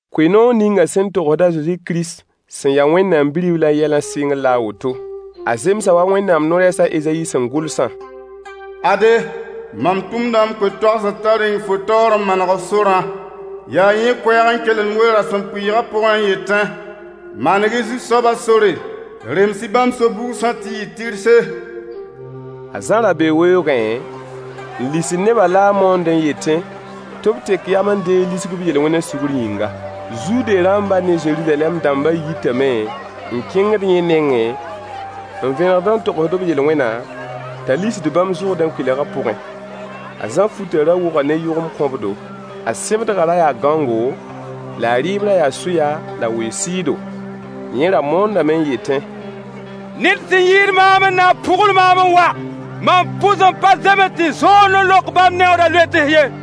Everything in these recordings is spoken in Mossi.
Koe-noog ninga sẽn togsd a Zezi Kirist sẽn ya Wẽnnaam Bi-riblã yɛlã sɩngr la a woto. A zemsa wa Wẽnnaam no-rɛɛs a Ezayi sẽn gʋlsã: Ade, mam tʋmda m koe-toagsd t'a reng fo taoor n maneg f sorã. Yaa yẽ koɛɛg n kelemd we-rasempʋɩɩgã pʋgẽ n yetẽ: Maneg-y Zu-soaba sore, rems-y bãmb so-bugsã tɩ yɩ tɩrse. A Zã ra bee weoogẽ n lisd nebã la a moondẽ n yetẽ tɩ b tek yam n deeg lisg b yel-wẽna sugr yĩnga. Zude rãmba ne Zeruzalɛm dãmba yitame n kẽngd yẽ nengẽ, n vẽnegd n togsd b yel-wẽna t'a lisd bãmb Zʋrdẽ kʋɩlga pʋgẽ. A Zã futã ra wʋga ne yʋgemd kõbdo. A sẽbdgã ra yaa gãongo, la a rɩɩb ra yaa sʋya la weoog sɩɩdo. Yẽ ra moondame n yetẽ: Ned sẽn yɩɩd maam n na n pʋgl maam n wa. Mam pʋs n pa zems tɩ zõond n lok bãmb neooda loets ye.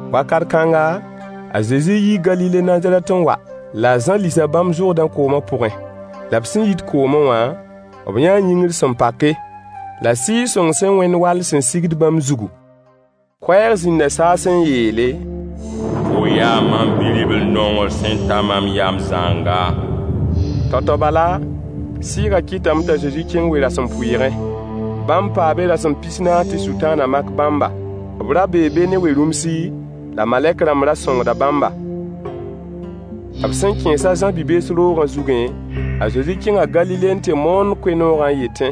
Wakat kãnga, a Zezi yii Galile Nazarɛt n wa, la a Zã lisa bãmb Zʋrdẽ kooma pʋgẽ. La b sẽn yit koomẽ wã, b yãa yĩngr sẽn pake, la Sɩɩg-sõng sẽn wẽnd wall sẽn sigd bãmb zugu. Koɛɛg zĩnda saasẽ n yeele: Fo yaa mam Bi-ribl-nongr sẽn ta mam yam zãnga. Tao-tao bala, Sɩɩgã kɩtame t'a Zezi kẽng we-rasempʋɩɩgẽ. Bãmb paa be rasem pis-naas tɩ Sʋtãanã mak bãmba. B ra bee be ne we-rũmsi, la malɛk-rãmb ra sõngda bãmba. B sẽn kẽes a Zã bi-bees roogã zugẽ, a Zezi kẽnga Galile n tɩ moond koe-noogã n yetẽ: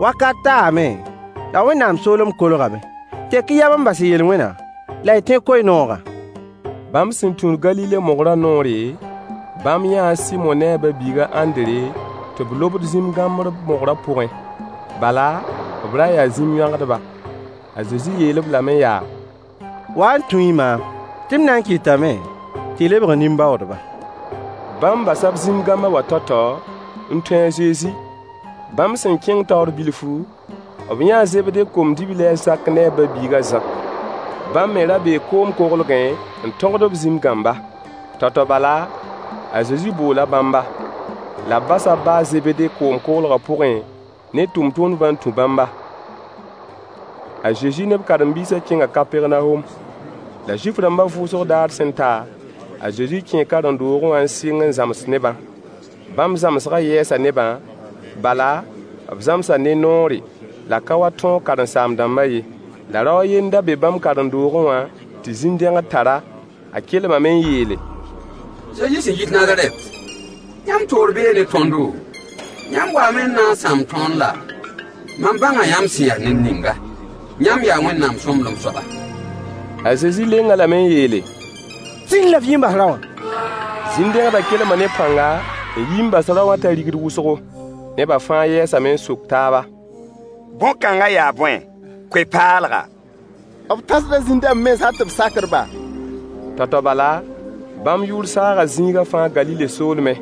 Wakat taame, la Wẽnnaam soolem kolgame. Tek-y yam n bas y yel-wẽna la y tẽ koe-noogã. Bãmb sẽn tũud Galile mogrã noore, bãmb yãa a Sɩmo ne a ba-biig a Ãndre tɩ b lobd zĩm-gãmbr mogrã pʋgẽ. Bala, b ra yaa zĩm-yõagdba. A Zezi yeel-b lame yaa: Wa n tũ-y maam, tɩ m na n kɩtame tɩ y lebg nin-baoodba. Bãmb basa b zĩm-gãmba wã tao-tao n tũ a Zezi. Bãmb sẽn kẽng taoor bilfu, b yãa a Zebde kom-dibli a Zak ne a ba-biig a Zã. Bãmb me ra bee koom-koglgẽ n tõgd b zĩm-gãmba. Tao-tao bala, a Zezi boola bãmba, la b basa b ba a Zebde koglgã pʋgẽ ne tʋmtʋmdbã n tũ bãmba. A Zezi ne b karen-biisã kẽnga Kapɛrnawom. La Zuif-rãmbã vʋʋsg daarã sẽn ta, a Zezi kẽe karen-doogẽ wã n sɩng n zãms nebã. Bãmb zãmsgã yɛɛsa nebã, bala, b zãmsa ne noore, la ka wa tõog karen-saam-dãmbã ye. La rao a yen n da be bãmb karen-doogẽ wã tɩ zĩn-dẽgd tar-a. A kelmame n yeele: Zezi sẽn yit Nazarɛt, yãmb toor bee ne tõndo? Yãmb waame n na n sãam tõnd laa? Mam bãnga yãmb sẽn ya ned ninga. Yãmb yaa Wẽnnaam sõmblem soaba. A Zezi leng-a lame n yeele: Sĩnd la f yi n bas rao wã. Zĩn-dẽgdã kelma ne pãnga, n yi n bas rao wã t'a rigd wʋsgo. Neba fãa yɛɛsame n sok taaba: Bõn-kãnga yaa bõe? Koe-paalga! B tãsda zĩn-dãmb mens hal tɩ b sakd-ba. Tao-tao bala, bãmb yʋʋr saaga zĩiga fãa Galile soolmẽ.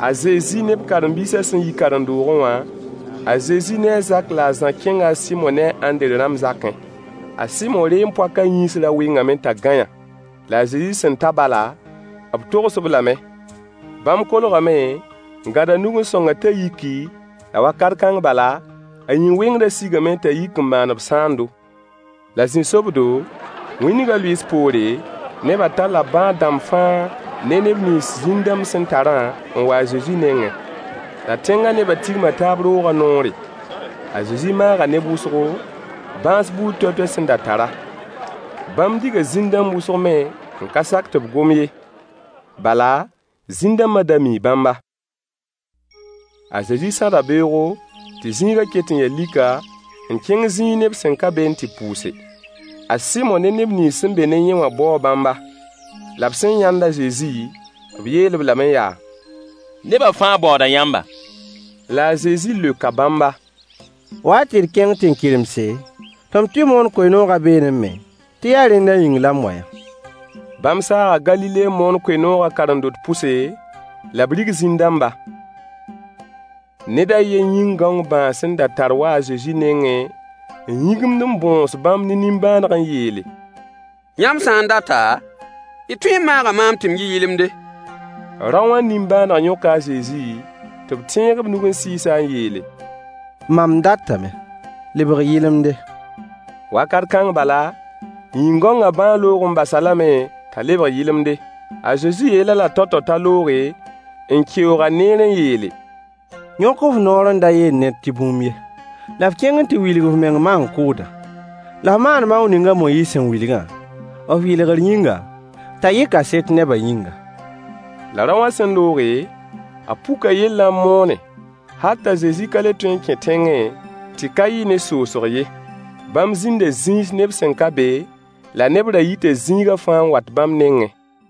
A Zezi ne b karen-biisã sẽn yi karen-doogẽ wã, a Zezi ne a Zak la a Zã kẽnga a Sɩmo ne a Ãndre rãmb zakẽ. A Sɩmo reem-poakã yĩns ra wɩngame t'a gãeyã. La a Zezi sẽn ta bala, b togs-b lame. Bãmb kolgame n gãd a nug n sõng-a t'a yiki, la wakat kãng bala, a yĩn-wɩngrã sigame t'a yik n maan-b sãando. La zĩ-sobdo, wĩndgã lʋɩɩs poore, neba talla bãad-dãmba fãa ne neb nins zĩn-dãmb sẽn tarã n wa a Zezi nengẽ. La tẽngã nebã tigma taab roogã noore. A Zezi maaga neb wʋsgo, bãas buud toay-toay sẽn da tara. Bãmb diga zĩn-dãmb wʋsg me n ka sak tɩ b gom ye, bala, zĩn-dãmba da mii bãmba. A Zezi sãda beoogo, tɩ zĩigã ket n ya lika, n kẽng zĩig neb sẽn ka be n tɩ pʋʋse. A Sɩmo ne neb nins sẽn be ne yẽ wã baoo bãmba. La b sẽn yãnd a Zezi, b yeel-b lame yaa: Neba fãa baooda yãmba. La a Zezi leoka bãmba: Wa-y tɩ d kẽng tẽn-kɩremse, tɩ m tɩ moon koe-noogã beene me, tɩ yaa rẽnda yĩng la m wa-yã. Bãmb saaga Galile n moon koe-noogã karen-dotã pʋse, la b rig zĩn-dãmba. Ned a yen yĩn-gãong bãag sẽn tar n wa a Zezi nengẽ n yĩgimd n bõos bãmb ne nimbãaneg n yeele: Yãmb sã n data, y tõe n maaga maam tɩ m yɩ yɩlemde. Rao wã nimbãaneg yõka a Zezi tɩ b tẽeg b nug n sɩɩs-a n yeele: Mam datame, lebg yɩlemde. Wakat kãng bala, yĩn-gãongã bãag loog n bas-a lame t'a lebg yɩlemde. A Zezi yeel-a-la tao-tao t'a looge, n keoog-a neer n yeele: Yõk f noor n da yeel ned tɩ bũmb ye. La f kẽng n tɩ wilg f meng maan-kʋʋdã, la f maan maoong ning a Moyiis sẽn wilgã, f yɩlgr yĩnga, t'a yɩ kaset neba yĩnga. La rao wã sẽn looge, a puka yellã n moone, hal t'a Zezi ka le tõe n kẽ tẽngẽ tɩ ka yɩ ne soosg ye. Bãmb zĩnda zĩis neb sẽn ka be, la neb ra yita zĩiga fãa n wat bãmb nengẽ.